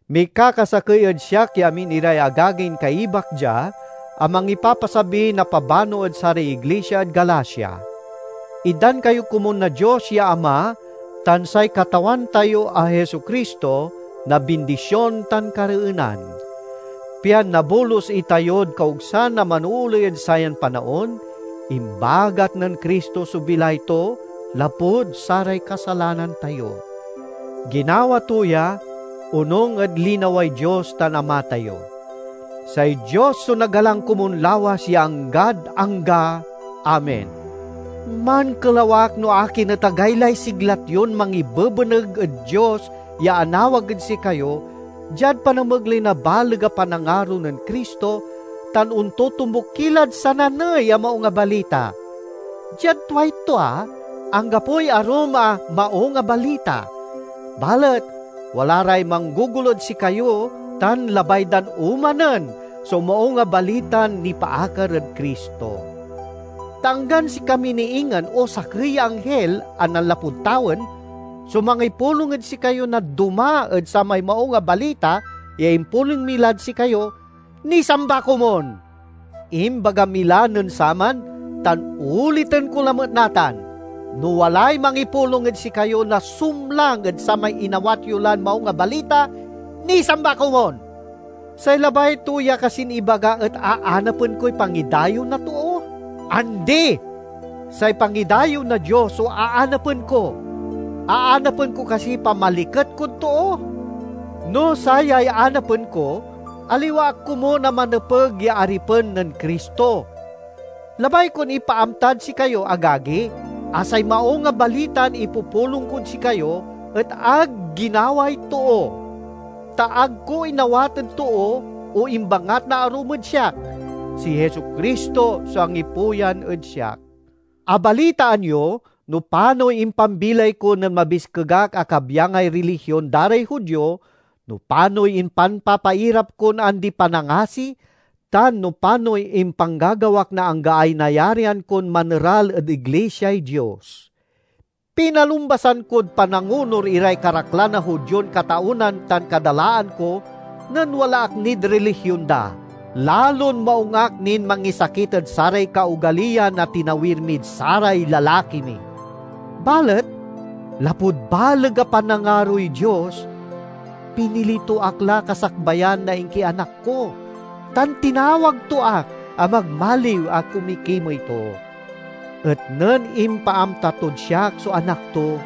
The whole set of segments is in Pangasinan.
Mikakasakey ed siak ya amin iray agagin kaibak dia a mangipapasabi na pabano ed saray iglisia ed Galacia: Itdan kayo komun na Dios ya Ama tan say Katawan tayo a Jesu-Cristo na bindision tan kareenan. Pian nabolus itayod kaogsan a manooley ed sayan panaon, imbagat nen Cristo so bilay to lapud saray kasalanan tayo. Ginawa to ya, onung ed linaway Dios tan Ama tayo. Say Dios so nagalang komun lawas ya anggad angga! Amen. Mankelaw ak no akin et agaylay siglat yon mangibebeneg ed Dios ya anawag ed sikayo diad panamegley na baleg a panangaro nen Cristo, tan ontotombuk ki lad sananey a maung a balita. Diad tuay tua, anggapoy arum a "maung a balita," balet wala ray manggogolo ed sikayo tan labay dan omanen so Maung a Balitan nipaakar ed Cristo. Ta anggan sikami ni ingen, o sakey ya anghil a nanlapud tawen, so mangipulong ed sikayo na doma ed samay Maung a Balita ya impulong mi lad sikayo, nisamba komun! Imbaga mi la nen saman, tan oliten ko lamet natan: no walay mangipulong ed sikayo na sumlang ed samay inawat yo lan Maung a Balita, nisamba komun! Say labay to ya kasin ibaga et aanapen koy pangidayew na too? Andi! Say pangidayew na Dios so aanapen ko. Aanapen ko kasiy pamaliket kod too? Na sayay anapen ko, aliwa ak komun a manepeg ya aripen nen Cristo. Labay kon ipaamtad sikayo, agagi, a say Maung a Balitan ipupulong kod sikayo et ag ginaway too. Ta ag ko inawat ed too, o imbangat na arum ed siak; si Jesu-Cristo so angipuyan ed siak. Abalitaan yo no panoy impambilay ko nen mabiskeg ak a kabyangay rilihion da ray Judio, no panoy impanpapairap kon andi-panangasi, tan no panoy impanggagawak na anggaay nayarian kon maneral ed iglisiay Dios. Pinalumbasan kod panangonur iray karaklan a Judion kataonan tan kadalaan ko nen wala ak nid rilihion da. Lalon maung ak nin mangisakit ed saray kaogaliyan a tinawir mid saray lalaki mi. Balet lapud baleg a panangaroy Dios, pinili to ak la kasakbayan na inkianak ko, tan tinawag to ak a magmaliw a kumikimey to. Et nen impaamta tod siak so Anak to,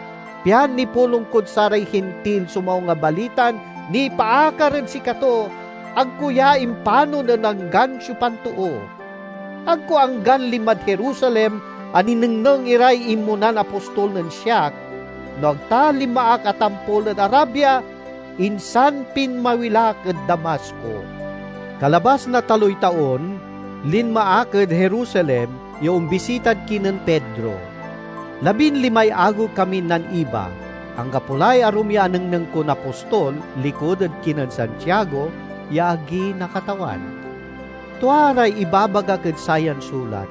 pian nipulong kod saray Hintil so Maung a Balitan nipaakar ed sikato, ag ko ya impanon ed anggan siopan too. Ag ko anggan linmad Jerusalem a ninengneng iray inmonan apostol nen siak, no ag ta linma ak a tampol ed Arabia, insan pinmawil ak ed Damasco. Kalabas na taloy taon linma ak ed Jerusalem ya ombisitad kinen Pedro. Labin limay agew kamin naniba. Anggapo lay arum ya anengneng kon apostol likud ed kinen Santiago ya agi na Katawan. Tua ray ibabagak ed sayan sulat.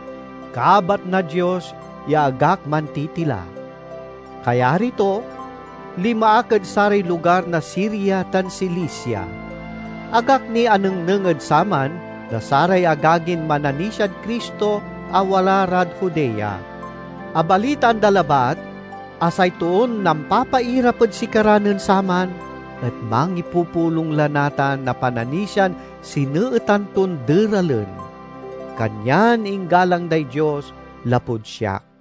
Kabat na Dios ya ag ak mantitila! Kayari to, linma ak ed saray lugar na Siria tan Cilicia. Ag ak ni anengneng ed saman na saray agagin mananisiad Cristo a wala rad Judea. Abalitaan da labat a say toon nampapairap ed sikara nen saman et mangipupulong la natan na pananisian sineetan ton deralen. Kanyan inggalang day Dios lapud siak.